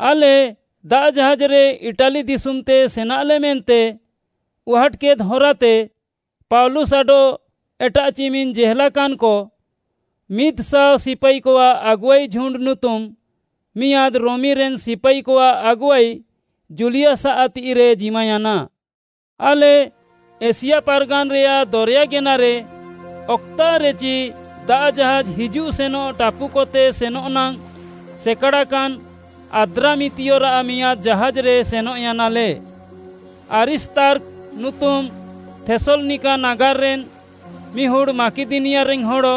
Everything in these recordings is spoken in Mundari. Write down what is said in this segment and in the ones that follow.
ଆଲେ ଦାଆଃ ଜାହାଜ୍‌ରେ ଇଟାଲି ଦିଶୁମ୍‌ତେ ସେନାଲେ ମେନ୍ତେ ଉହାଟ୍‌କେଦ୍‌ ହରାତେ ପାଉଲୁସ୍‌ ଆଡଃ ଏଟାଃ ଚିମିନ୍‌ ଜେହେଲାକାନ୍‌କ “ମିଦ୍‌ଶାଅ ସିପାଇକଆଃ ଆଗୁଆଇ ଝୁଣ୍ଡ୍‌” ନୁତୁମ୍‌, ମିଆଁଦ୍‌ ରୋମିରେନ୍‌ ସିପାଇକଆଃ ଆଗୁଆଇ ଜୁଲିୟସ୍‌ଆଃ ତିଃଇରେ ଜିମାୟାନା। ଆଲେ ଏସିଆ ପାର୍‌ଗାନ୍‌ରେୟାଃ ଦରେୟା ଗେନାରେ ଅକ୍‌ତାଃରେଚି ଦାଆଃ ଜାହାଜ୍‌ ହିଜୁଃ ସେନଃ ଟାପୁକତେ ସେନଃ ନାଙ୍ଗ୍‌ ସେକାଡ଼ାକାନ୍‌ ଆଦ୍ରାମିତିୟରାଃ ମିଆଁଦ୍‌ ଜାହାଜ୍‌ରେ ସେନଃୟାନାଲେ। ଆରିସ୍ତାର୍ଖ ନୁତୁମ୍‌ ଥେସ୍‌ଲନିକା ନାଗାର୍‌ରେନ୍‌ ମିହୁଡ଼୍‌ ମାକିଦନିଆରେନ୍‌ ହଡ଼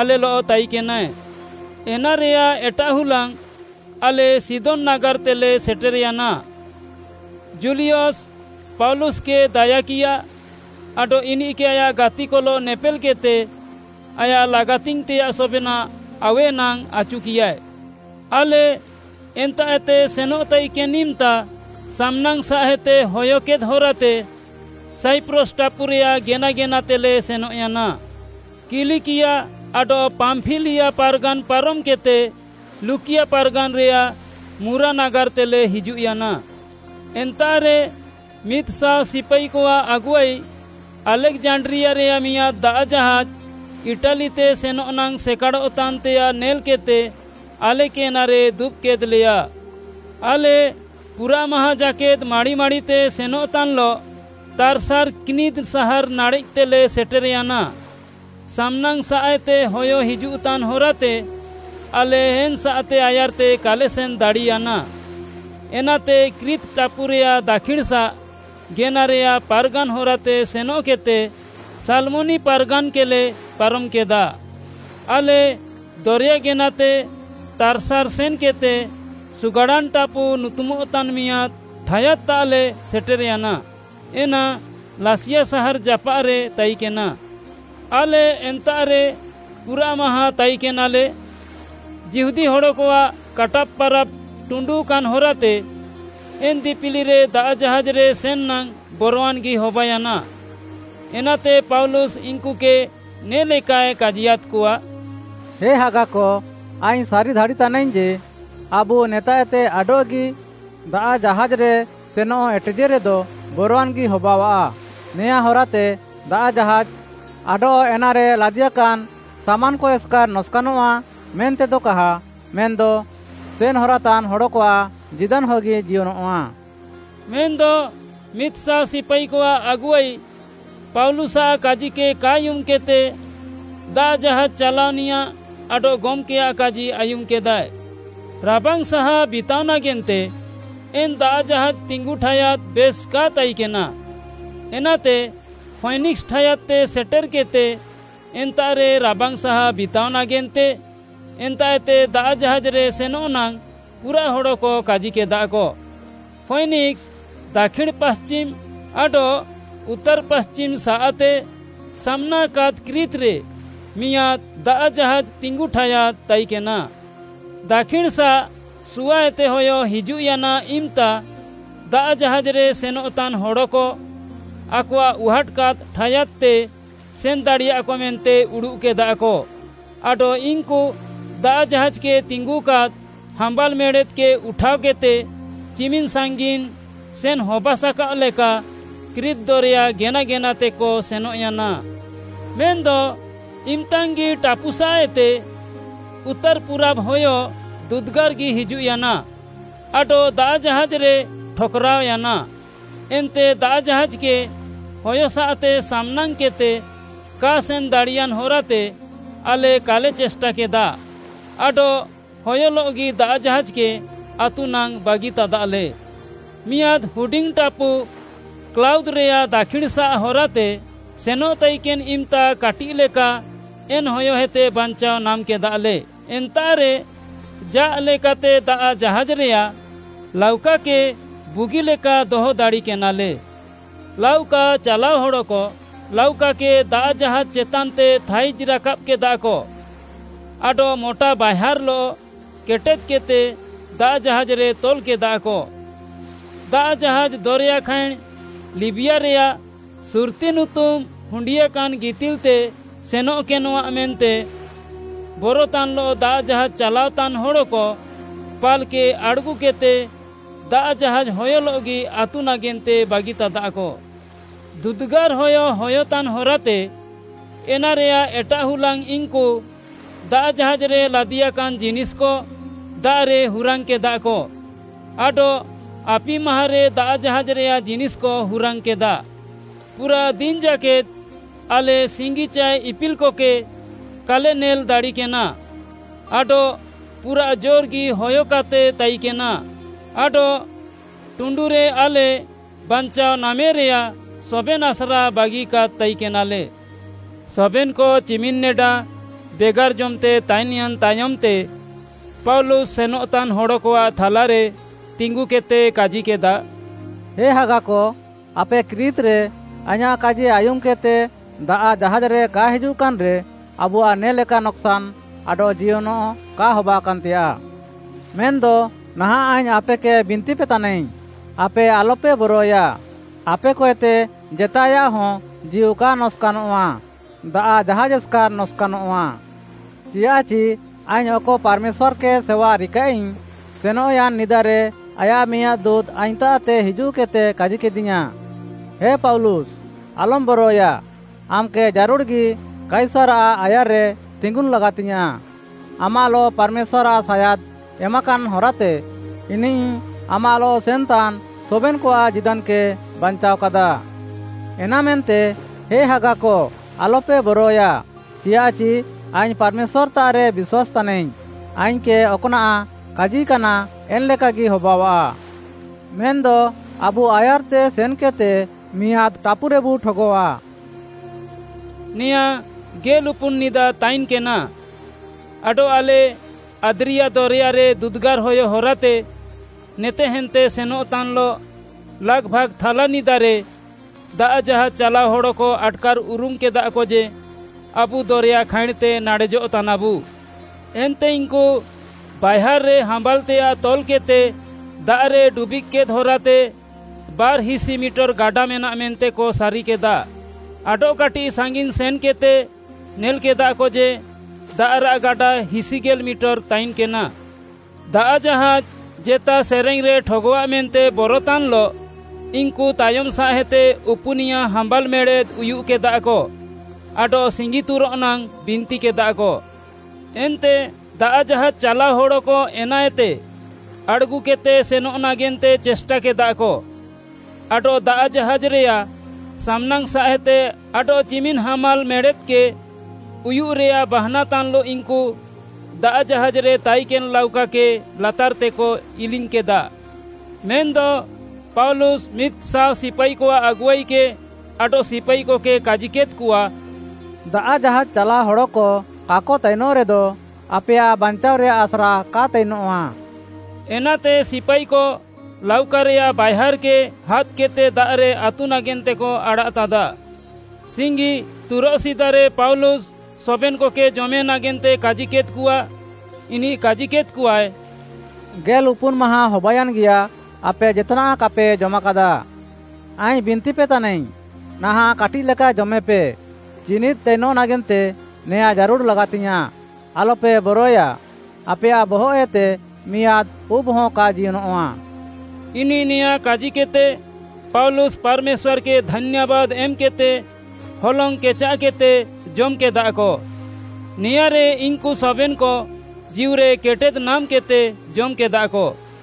ଆଲେଲଃ ତାଇକେନାଏ। ଏନାରେୟାଃ ଏଟାଃହୁଲାଙ୍ଗ୍‌ ଆଲେ ସିଦୋନ୍‌ ନାଗାର୍‌ତେଲେ ସେଟେର୍‌ୟାନା। ଜୁଲିୟସ୍‌ ପାଉଲୁସ୍‌କେ ଦାୟାକିୟା ଆଡଃ ଇନିଃକେ ଆୟାଃ ଗାତିକଲଃ ନେପେଲ୍‌କେଦ୍‌ତେ, ଆୟାଃ ଲାଗାତିଙ୍ଗ୍‌ତେୟାଃ ସବେନାଃ ଆଉୱେ ନାଙ୍ଗ୍‌ ଆଚୁକିୟାଏ। ଆଲେ ଏନ୍ତାଃଏତେ ସେନଃ ତାଇକେନ୍‌ ଇମ୍‌ତା ସାମ୍‌ନାଙ୍ଗ୍‌ସାଃଏତେ ହୟକେଦ୍‌ ହରାତେ ସାଇପ୍ରସ୍‌ ଟାପୁରେୟାଃ ଗେନା ଗେନାତେଲେ ସେନଃୟାନା। କିଲିକିଆ ଆଡଃ ପାମ୍ପିଲିଆ ପାର୍‌ଗାନ୍‌ ପାରମ୍‌କେଦ୍‌ତେ ଲୁକିଆ ପାର୍‌ଗାନ୍‌ରେୟାଃ ମୁରା ନାଗାର୍‌ତେଲେ ହିଜୁଃୟାନା। ଏନ୍ତାଃରେ ମିଦ୍‌ଶାଅ ସିପାଇକଆଃ ଆଗୁଆଇ ଆଲେକ୍‌ଜାଣ୍ଡ୍ରିଆରେୟାଃ ମିଆଁଦ୍‌ ଦାଆଃ ଜାହାଜ୍‌ ଇଟାଲିତେ ସେନଃ ନାଙ୍ଗ୍‌ ସେକାଡ଼ଃତାନ୍‌ତେୟାଃ ନେଲ୍‌କେଦ୍‌ତେ ଆଲେକେ ଏନାରେ ଦୁବ୍‌କେଦ୍‌ଲେୟା। ଆଲେ ପୁରାଃମାହାଁଁ ଜାକେଦ୍‌ ମାଡ଼ି ମାଡ଼ିତେ ସେନଃତାନ୍‌ଲଃ ତାର୍‌ସାର୍‌ କ୍ନିଦ୍‌ ସାହାର୍‌ ନାଡ଼େଃତେଲେ ସେଟେର୍‌ୟାନା। ସାମ୍‌ନାଙ୍ଗ୍‌ସାଃଏତେ ହୟ ହିଜୁଃତାନ୍‌ ହରାତେ ଆଲେ ଏନ୍‌ସାଃତେ ଆୟାର୍‌ତେ କାଲେ ସେନ୍‌ ଦାଡ଼ିୟାନା, ଏନାତେ କ୍ରିତ୍‌ ଟାପୁରେୟାଃ ଦାକ୍ଷିଣ୍‌ସାଃ ଗେନାରେୟାଃ ପାର୍‌ଗାନ୍‌ ହରାତେ ସେନଃକେଦ୍‌ତେ ସାଲ୍‌ମୋନି ପାର୍‌ଗାନ୍‌କେଲେ ପାରମ୍‌କେଦା। ଆଲେ ଦରେୟା ଗେନାତେ ତାର୍‌ସାର୍‌ ସେନ୍‌କେଦ୍‌ତେ “ସୁଗାଡ଼ାନ୍‌ ଟାପୁ” ନୁତୁମଃତାନ୍‌ ମିୟାଦ୍‌ ଠାୟାଦ୍‌ତାଃଲେ ସେଟେର୍‌ୟାନା। ଏନା ଲାସିଆ ସାହାର୍‌ ଜାପାଃରେ ତାଇକେନା। ଆଲେ ଏନ୍ତାଃରେ ପୁରାଃମାହାଁଁ ତାଇକେନାଲେ। ଯିହୁଦୀ ହଡ଼କଆଃ କାଟାବ୍‌ ପାରାବ୍‌ ଟୁଣ୍ଡୁକାନ୍‌ ହରାତେ, ଏନ୍‌ ଦିପିଲିରେ ଦାଆଃ ଜାହାଜ୍‌ରେ ସେନ୍‌ ନାଙ୍ଗ୍‌ ବରୱାନ୍‌ଗି ହବାୟାନା। ଏନାତେ ପାଉଲୁସ୍‌ ଇନ୍‌କୁକେ ନେ'ଲେକାଏ କାଜିୟାଦ୍‌କଆ, “ହେ ହାଗାକ, ଆଇଙ୍ଗ୍‌ ସାରି ଦାଡ଼ିତାନାଇଙ୍ଗ୍‌ ଯେ, ଆବୁ ନେତାଃଏତେ ଆଡଃଗି ଦାଆଃ ଜାହାଜ୍‌ରେ ସେନଃ ଏଟେଜେରେଦ ବରୱାନ୍‌ଗି ହବାଅଃଆ। ନେଆଁ ହରାତେ ଦାଆଃ ଜାହାଜ୍‌ ଆଡଃ ଏନାରେ ଲାଦିଆକାନ୍‌ ସାମାନ୍‌କ ଏସ୍‌କାର୍‌ ନକ୍‌ସାନଃଆ ମେନ୍ତେଦ କାହା ମେନ୍‌ଦ ସେନ୍‌ ହରାତାନ୍‌ ହଡ଼କଆଃ ଜୀଦାନ୍‌ହଗି ଜିୟନଃଆ।” ମେନ୍‌ଦ ମିଦ୍‍ଶାଅ ସିପାଇକଆଃ ଆଗୁଆଇ ପାଉଲୁସ୍‌ଆଃ କାଜିକେ କା ଆୟୁମ୍‌କେଦ୍‌ତେ, ଦାଆଃ ଜାହାଜ୍‌ ଚାଲାଅନିୟାଃ ଆଡଃ ଗମ୍‌କେୟାଃ କାଜି ଆୟୁମ୍‌କେଦାଏ। ରାବାଙ୍ଗ୍‌ ସାହା ବିତାଅ ନାଗେନ୍ତେ ଏନ୍‌ ଦାଆଃ ଜାହାଜ୍‌ ତିଙ୍ଗୁ ଠାୟାଦ୍‌ ବେଶ୍‌ କା ତାଇକେନା। ଏନାତେ ଫୈନିକ୍‌ସ୍‌ ଠାୟାଦ୍‌ତେ ସେଟେର୍‌କେଦ୍‌ତେ ଏନ୍ତାଃରେ ରାବାଙ୍ଗ୍‌ ସାହା ବିତାଅ ନାଗେନ୍ତେ ଏନ୍ତାଃଏତେ ଦାଆଃ ଜାହାଜ୍‌ରେ ସେନଃ ନାଙ୍ଗ୍‌ ପୁରାଃ ହଡ଼କ କାଜିକେଦାକ। ଫୈନିକ୍‌ସ୍‌ ଦାକ୍ଷିଣ୍‌ ପାଶ୍ଚିମ୍‌ ଆଡଃ ଉତ୍ତାର୍‌ ପାଶ୍ଚିମ୍‌ସାଃତେ ସାମ୍‌ନାଙ୍ଗ୍‌କାଦ୍‌ କ୍ରିତ୍‌ରେ ମିଆଁଦ୍‌ ଦାଆଃ ଜାହାଜ୍‌ ତିଙ୍ଗୁ ଠାୟାଦ୍‌ ତାଇକେନା। ଦାକ୍ଷିଣ୍‌ସାଃଏତେ ସୁଆଏତେ ହୟ ହିଜୁଃୟାନା ଇମ୍‌ତା, ଦାଆଃ ଜାହାଜ୍‌ରେ ସେନଃତାନ୍‌ ହଡ଼କ ଆକଆଃ ଉହାଟ୍‌କାଦ୍‌ ଠାୟାଦ୍‌ତେ ସେନ୍‌ ଦାଡ଼ିୟାକ ମେନ୍ତେ ଉଡ଼ୁଃକେଦାକ, ଆଡଃ ଇନ୍‌କୁ ଦାଆଃ ଜାହାଜ୍‌କେ ତିଙ୍ଗୁକାଦ୍‌ ହାମ୍ବାଲ୍‌ ମେଡ଼େଦ୍‌କେ ଉଠାଅକେଦ୍‌ତେ ଚିମିନ୍‌ ସାଙ୍ଗିନ୍‌ ସେନ୍‌ ହବାସାକାଅଃ ଲେକା କ୍ରିତ୍‌ ଦରେୟା ଗେନା ଗେନାତେକ ସେନଃୟାନା। ମେନ୍‌ଦ ଇମ୍‌ତାଙ୍ଗି ଟାପୁସାଃଏତେ ଉତ୍ତାର୍‌ ପୁରାବ୍‌ ହୟ ଦୁଦୁଗାର୍‌ଗି ହିଜୁଃୟାନା, ଆଡଃ ଦାଆଃ ଜାହାଜ୍‌ରେ ଠକ୍‌ରାଅୟାନା। ଏନ୍ତେ ଦାଆଃ ଜାହାଜ୍‌କେ ହୟସାଃତେ ସାମ୍‌ନାଙ୍ଗ୍‌କେଦ୍‌ତେ କା ସେନ୍‌ ଦାଡ଼ିୟାନ୍‌ ହରାତେ ଆଲେ କାଲେ ଚେଷ୍ଟାକେଦା ଆଡଃ ହୟଲଃଗି ଦାଆଃ ଜାହାଜ୍‌କେ ଆତୁ ନାଙ୍ଗ୍‌ ବାଗିତାଦାଲେ। ମିଆଁଦ୍‌ ହୁଡିଙ୍ଗ୍‌ ଟାପୁ କ୍ଲାଉଦ୍‌ରେୟାଃ ଦାକ୍ଷିଣ୍‌ସାଃ ହରାତେ ସେନଃ ତାଇକେନ୍‌ ଇମ୍‌ତା କାଟିଃଲେକା ଏନ୍‌ ହୟଏତେ ବାଞ୍ଚାଅ ନାମ୍‌କେଦାଲେ। ଏନ୍ତାଃରେ ଜା'ଲେକାତେ ଦାଆଃ ଜାହାଜ୍‌ରେୟାଃ ଲାଉକାକେ ବୁଗିଲେକା ଦହ ଦାଡ଼ିକେନାଲେ। ଲାଉକା ଚାଲାଅ ହଡ଼କ ଲାଉକାକେ ଦାଆଃ ଜାହାଜ୍‌ ଚେତାନ୍‌ତେ ଥାଇଜ୍‌ ରାକାବ୍‌କେଦାକ ଆଡଃ ମୋଟା ବାଏହାର୍‌ଲଃ କେଟେଦ୍‌କେଦ୍‌ତେ ଦାଆଃ ଜାହାଜ୍‌ରେ ତଲ୍‌କେଦାକ। ଦାଆଃ ଜାହାଜ୍‌ ଦରେୟା ଖାଇଁଣ୍‌ ଲିବିଆରେୟାଃ ସୁର୍ତ୍ତି ନୁତୁମ୍‌ ହୁଣ୍ଡିଆକାନ୍‌ ଗିତିଲ୍‌ତେ ସେନଃକେନଃଆ ମେନ୍ତେ ବରତାନ୍‌ଲଃ ଦାଆଃ ଜାହାଜ୍‌ ଚାଲାଅତାନ୍‌ ହଡ଼କ ପାଲ୍‌କେ ଆଡ଼୍‌ଗୁକେଦ୍‌ତେ ଦାଆଃ ଜାହାଜ୍‌ ହୟଲଃଗି ଆତୁ ନାଗେନ୍ତେ ବାଗିତାଦାକ। ଦୁଦୁଗାର୍‌ ହୟ ହୟତାନ୍‌ ହରାତେ ଏନାରେୟାଃ ଏଟାଃ ହୁଲାଙ୍ଗ୍‌ ଇନ୍‌କୁ ଦାଆଃ ଜାହାଜ୍‌ରେ ଲାଦିଆକାନ୍‌ ଜିନିଷ୍‌କ ଦାଆଃରେ ହୁରାଙ୍ଗ୍‌କେଦାକ, ଆଡଃ ଆପି ମାହାଁରେ ଦାଆଃ ଜାହାଜ୍‌ରେୟାଃ ଜିନିଷ୍‌କ ହୁରାଙ୍ଗ୍‌କେଦା। ପୁରାଃ ଦିନ୍‍ ଜାକେଦ୍‌ ଆଲେ ସିଙ୍ଗି ଚାଏ ଇପିଲ୍‌କକେ କାଲେ ନେଲ୍‌ ଦାଡ଼ିକେନା ଆଡଃ ପୁରାଃ ଜୋର୍‌ଗି ହୟକାତେ ତାଇକେନା, ଆଡଃ ଟୁଣ୍ଡୁରେ ଆଲେ ବାଞ୍ଚାଅ ନାମେରେୟାଃ ସବେନ୍‌ ଆସ୍ରା ବାଗିକାଦ୍‌ ତାଇକେନାଲେ। ସବେନ୍‌କ ଚିମିନ୍‌ନେଡା ବେଗାର୍‌ ଜମ୍‌ତେ ତାଇନ୍‌ୟାନ୍‌ ତାୟମ୍‌ତେ ପାଉଲୁସ୍‌ ସେନଃତାନ୍‌ ହଡ଼କଆଃ ଥାଲାରେ ତିଙ୍ଗୁକେଦ୍‌ତେ କାଜିକେଦା, “ହେ ହାଗାକ, ଆପେ କ୍ରିତ୍‌ରେ ଆଇଁୟାଃ କାଜି ଆୟୁମ୍‌କେଦ୍‌ତେ ଦାଆଃ ଜାହାଜ୍‌ରେ କା ହିଜୁଃକାନ୍‌ରେ, ଆବୁଆଃ ନେ'ଲେକା ନକ୍‌ସାନ୍‌ ଆଡଃ ଜିୟନ୍‌ କା ହବାକାନ୍‌ତେୟାଃ। ମେନ୍‌ଦ ନାହାଁଃ ଆଇଙ୍ଗ୍‌ ଆପେକେ ବିନ୍ତିପେତାନାଇଙ୍ଗ୍‌, ଆପେ ଆଲପେ ବରଏୟା, ଆପେକଏତେ ଜେତାଏୟାଃହ ଜୀଉ କା ନକ୍‌ସାନଃଆ, ଦାଆଃ ଜାହାଜ୍‌ ଏସ୍‌କାର୍‌ ନକ୍‌ସାନଃଆ। ଚିଆଃଚି ଆଇଙ୍ଗ୍‌ ଅକ ପାର୍‌ମେଶ୍ୱାର୍‌କେ ସେୱା ରିକାଃଇଙ୍ଗ୍‌, ସେନଃୟାନ୍‌ ନିଦାରେ ଆୟାଃ ମିଆଁଦ୍‌ ଦୁଁତ୍‌ ଆଇଙ୍ଗ୍‌ତାଃତେ ହିଜୁଃକେଦ୍‌ତେ କାଜିକେଦିୟାଁ, ‘ଏ ପାଉଲୁସ୍‌ ଆଲମ୍‌ ବରଏୟା, ଆମ୍‌କେ ଜାରୁଡ଼୍‌ଗି କାଇସାର୍‌ଆଃ ଆୟାର୍‌ରେ ତିଙ୍ଗୁନ୍‌ ଲାଗାତିଙ୍ଗ୍‌ୟାଁଃ। ଆମାଃଲଃ ପାର୍‌ମେଶ୍ୱାର୍‌ଆଃ ସାୟାଦ୍‌ ଏମାକାନ୍‌ ହରାତେ, ଇନିଃ ଆମାଃଲଃ ସେନ୍‌ତାନ୍‌ ସବେନ୍‌କଆଃ ଜୀଦାନ୍‌କେ ବାଞ୍ଚାଅକାଦା।’ ଏନାମେନ୍ତେ, ହେ ହାଗାକ ଆଲପେ ବରଏୟା, ଚିଆଃଚି ଆଇଙ୍ଗ୍‌ ପାର୍‌ମେଶ୍ୱାର୍‌ତାଃରେ ବିଶ୍ୱାସ୍‌ତାନାଇଙ୍ଗ୍‌, ଆଇଙ୍ଗ୍‌କେ ଅକ୍‌ନାଃ କାଜିକାନା ଏନ୍‌ଲେକାଗି ହବାଅଆଃ। ମେନ୍‌ଦ ଆବୁ ଆୟାର୍‌ତେ ସେନ୍‌କେଦ୍‌ତେ ମିଆଁଦ୍‌ ଟାପୁରେବୁ ଠଗଃଆ।” ନେଆଁ ଗେଲ୍‌ଉପୁନ୍‌ ନିଦା ତାଇନ୍‌କେନା, ଆଡଃ ଆଲେ ଆଦ୍ରିଆ ଦରେୟାରେ ଦୁଦୁଗାର୍‌ ହୟ ହରାତେ ନେତେହେନ୍ତେ ସେନଃତାନ୍‌ଲଃ ଲାଗ୍‌ଭାଗ୍‌ ଥାଲାନିଦାରେ ଦାଆଃ ଜାହାଜ୍‌ ଚାଲାଅ ହଡ଼କ ଆଟ୍‌କାର୍‌ ଉରୁମ୍‌କେଦାକ ଯେ, ଆବୁ ଦରେୟା ଖାଇଁଣ୍‌ତେ ନାଡ଼େଜଃତାନାବୁ। ଏନ୍ତେ ଇନ୍‌କୁ ବାଏହାର୍‌ରେ ହାମ୍ବାଲ୍‌ତେୟାଃ ତଲ୍‌କେଦ୍‌ତେ ଦାଆଃରେ ଡୁବିଃଗ୍‌କେଦ୍‌ ହରାତେ ବାର୍‌ହିସି ମିଟର୍‌ ଗାଡା ମେନାଃ ମେନ୍ତେକ ସାରିକେଦା। ଆଡଃକାଟିଃ ସାଙ୍ଗିନ୍‌ ସେନ୍‌କେଦ୍‌ତେ ନେଲ୍‌କେଦାକ ଯେ, ଦାଆଃରାଃ ଗାଡା ହିସିଗେଲ୍‌ ମିଟର୍‌ ତାଇନ୍‌କେନା। ଦାଆଃ ଜାହାଜ୍‌ ଜେତା ସେରେଙ୍ଗ୍‌ରେ ଠଗଃଆଃ ମେନ୍ତେ ବରତାନ୍‌ଲଃ ଇନ୍‌କୁ ତାୟମ୍‌ସାଃଏତେ ଉପୁନିୟା ହାମ୍ବାଲ୍‌ ମେଡ଼େଦ୍‌ ଉୟୁଃକେଦାକ ଆଡଃ ସିଙ୍ଗିତୁରଃ ନାଙ୍ଗ୍‌ ବିନ୍ତିକେଦାକ। ଏନ୍ତେ ଦାଆଃ ଜାହାଜ୍‌ ଚାଲାଅ ହଡ଼କ ଏନାଏତେ ଆଡ଼୍‌ଗୁକେଦ୍‌ତେ ସେନଃ ନାଗେନ୍ତେ ଚେଷ୍ଟାକେଦାକ, ଆଡଃ ଦାଆଃ ଜାହାଜ୍‌ରେୟାଃ ସାମ୍‌ନାଙ୍ଗ୍‌ସାଃଏତେ ଆଡଃଚିମିନ୍‌ ହାମ୍ବାଲ୍‌ ମେଡ଼େଦ୍‌କେ ଉୟୁଃରେୟାଃ ବାହାନାତାନ୍‌ଲଃ ଇନ୍‌କୁ ଦାଆଃ ଜାହାଜ୍‌ରେ ତାଇକେନ୍‌ ଲାଉକାକେ ଲାତାର୍‌ତେକ ଇଲିଙ୍ଗ୍‌କେଦା। ମେନ୍‌ଦ ପାଉଲୁସ୍‌ ମିଦ୍‌ଶାଅ ସିପାଇକଆଃ ଆଗୁଆଇକେ ଆଡଃ ସିପାଇକକେ କାଜିକେଦ୍‌କଆ, “ଦାଆଃ ଜାହାଜ୍‌ ଚାଲାଅ ହଡ଼କ କାକ ତାଇନଃରେଦ, ଆପେୟାଃ ବାଞ୍ଚାଅଃରେୟାଃ ଆସ୍ରା କା ତାଇନଃଆ।” ଏନାତେ ସିପାଇକ ଲାଉକାରେୟାଃ ବାଏହାର୍‌କେ ହାଦ୍‌କେଦ୍‌ତେ ଦାଆଃରେ ଆତୁ ନାଗେନ୍ତେକ ଆଡ଼ାଃତାଦା। ସିଙ୍ଗିତୁରଃ ସିଦାରେ ପାଉଲୁସ୍‌ ସବେନ୍‌କକେ ଜମେ ନାଗେନ୍ତେ କାଜିକେଦ୍‌କଆ। ଇନିଃ କାଜିକେଦ୍‌କଆଏ, “ଗେଲ୍‌ଉପୁନ୍‌ ମାହାଁ ହବାୟାନ୍‌ଗିୟା ଆପେ ଜେତ୍‌ନାଃ କାପେ ଜମ୍‌କାଦା। ଆଇଙ୍ଗ୍‌ ବିନ୍ତିପେ ତାନାଇଙ୍ଗ୍‌, ନାହାଁଃ କାଟିଃଲେକା ଜମେପେ, ଜୀନିଦ୍‌ ତାଇନଃ ନାଗେନ୍ତେ ନେଆଁ ଜାରୁଡ଼୍‌ ଲାଗାତିଙ୍ଗ୍‌ୟାଁଃ। ଆଲପେ ବରଏୟା, ଆପେୟାଃ ବହଃଏତେ ମିଆଁଦ୍‌ ଉବ୍‌ହ କା ଜିୟନଃଆ।” ଇନିଃ ନେଆଁଁ କାଜିକେଦ୍‌ତେ, ପାଉଲୁସ୍‌ ପାର୍‌ମେଶ୍ୱାର୍‌କେ ଧାନ୍ୟାବାଦ୍‌ ଏମ୍‌କେଦ୍‌ତେ ହଲଙ୍ଗ୍‌ କେଚାଃକେଦ୍‌ତେ ଜମ୍‌କେଦାକ। ନେଆଁରେ ଇନ୍‌କୁ ସବେନ୍‌କ ଜୀଉରେ କେଟେଦ୍‌ ନାମ୍‌କେଦ୍‌ତେ ଜମ୍‌କେଦାକ।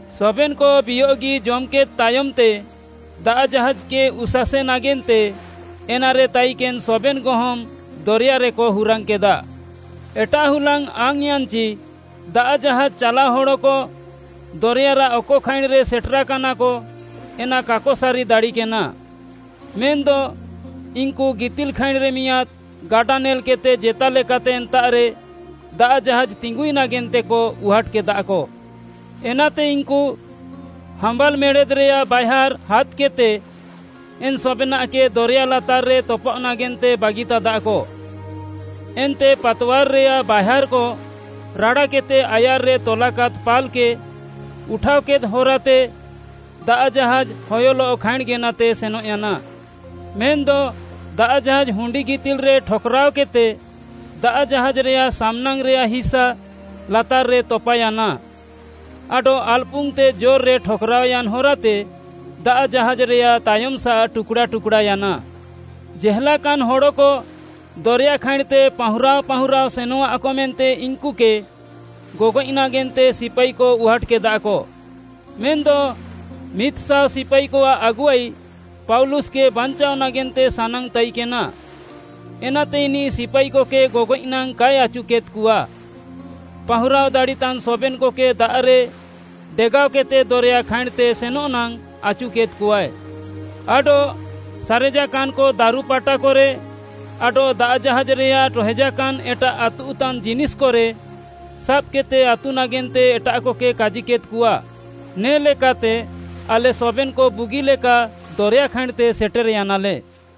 ସବେନ୍‌କ ବିୟଃଗି ଜମ୍‌କେଦ୍‌ ତାୟମ୍‌ତେ ଦାଆଃ ଜାହାଜ୍‌କେ ଉସାସେ ନାଗେନ୍ତେ ଏନାରେ ତାଇକେନ୍‌ ସବେନ୍‌ ଗହମ୍‌ ଦରେୟାରେକ ହୁରାଙ୍ଗ୍‌କେଦା। ଏଟାଃ ହୁଲାଙ୍ଗ୍‌ ଆଙ୍ଗ୍‌ୟାନ୍‌ଚି, ଦାଆଃ ଜାହାଜ୍‌ ଚାଲାଅ ହଡ଼କ ଦରେୟାରାଃ ଅକ ଖାଇଁଣ୍‌ରେ ସେଟେରାକାନାକ ଏନା କାକ ସାରି ଦାଡ଼ିକେନା। ମେନ୍‌ଦ ଇନ୍‌କୁ ଗିତିଲ୍‌ଖାଇଁଣ୍‌ରେ ମିଆଁଦ୍‌ ଗାଡା ନେଲ୍‌କେଦ୍‌ତେ ଜେତାଲେକାତେ ଏନ୍ତାଃରେ ଦାଆଃ ଜାହାଜ୍‌ ତିଙ୍ଗୁଇ ନାଗେନ୍ତେକ ଉହାଟ୍‌କେଦାକ। ଏନାତେ ଇନ୍‌କୁ ହାମ୍ବାଲ୍‌ ମେଡ଼େଦ୍‌ରେୟାଃ ବାଏହାର୍‌ ହାଦ୍‌କେଦ୍‌ତେ ଏନ୍‌ ସବେନାଃକେ ଦରେୟା ଲାତାର୍‌ରେ ତପାଅଃ ନାଗେନ୍ତେ ବାଗିତାଦାକ। ଏନ୍ତେ ପାତୱାର୍‌ରେୟାଃ ବାଏହାର୍‌କ ରାଡ଼ାକେଦ୍‌ତେ ଆୟାର୍‌ରେ ତଲାକାଦ୍‌ ପାଲ୍‌କେ ଉଠାଅକେଦ୍‌ ହରାତେ ଦାଆଃ ଜାହାଜ୍‌ ହୟଲଃ ଖାଇଁଣ୍‌ ଗେନାତେ ସେନଃୟାନା। ମେନ୍‌ଦ ଦାଆଃ ଜାହାଜ୍‌ ହୁଣ୍ଡିଗିତିଲ୍‌ରେ ଠକ୍‌ରାଅକେଦ୍‌ତେ ଦାଆଃ ଜାହାଜ୍‌ରେୟାଃ ସାମ୍‌ନାଙ୍ଗ୍‌ରେୟାଃ ହିସା ଲାତାର୍‌ରେ ତପାୟାନା ଆଡଃ ଆଲ୍‌ପୁଙ୍ଗ୍‌ତେ ଜୋର୍‌ରେ ଠକ୍‌ରାଅୟାନ୍‌ ହରାତେ ଦାଆଃ ଜାହାଜ୍‌ରେୟାଃ ତାୟମ୍‌ସାଃ ଟୁକ୍‌ଡ଼ା ଟୁକ୍‌ଡ଼ାୟାନା। ଜେହେଲାକାନ୍‌ ହଡ଼କ ଦରେୟା ଖାଇଁଣ୍‌ତେ ପାହୁଁରାଅ ପାହୁଁରାଅ ସେନଃଆକ ମେନ୍ତେ ଇନ୍‌କୁକେ ଗଗଏଃ ନାଗେନ୍ତେ ସିପାଇକ ଉହାଟ୍‌କେଦାକ। ମେନ୍‌ଦ ମିଦ୍‍ଶାଅ ସିପାଇକଆଃ ଆଗୁଆଇ ପାଉଲୁସ୍‌କେ ବାଞ୍ଚାଅ ନାଗେନ୍ତେ ସାନାଙ୍ଗ୍‌ତାଇକେନା, ଏନାତେ ଇନିଃ ସିପାଇକକେ ଗଗଏଃ ନାଙ୍ଗ୍‌ କାଏ ଆଚୁକେଦ୍‌କଆ। ପାହୁଁରାଅ ଦାଡ଼ିତାନ୍‌ ସବେନ୍‌କକେ ଦାଆଃରେ ଡେଗାଅକେଦ୍‌ତେ ଦରେୟା ଖାଇଁଣ୍‌ତେ ସେନଃ ନାଙ୍ଗ୍‌ ଆଚୁକେଦ୍‌କଆଏ। ଆଡଃ ସାରେଜାକାନ୍‍କ ଦାରୁପାଟାକରେ ଆଡଃ ଦାଆଃ ଜାହାଜ୍‌ରେୟାଃ ଟହେଜାକାନ୍‌ ଏଟାଃ ଆତୁଃତାନ୍‌ ଜିନିଷ୍‍କରେ ସାବ୍‌କେଦ୍‌ତେ ଆତୁଃ ନାଗେନ୍ତେ ଏଟାଃକକେ କାଜିକେଦ୍‌କଆ। ନେ'ଲେକାତେ ଆଲେ ସବେନ୍‌କ ବୁଗିଲେକା ଦରେୟା ଖାଇଁଣ୍‌ତେ ସେଟେର୍‌ୟାନାଲେ।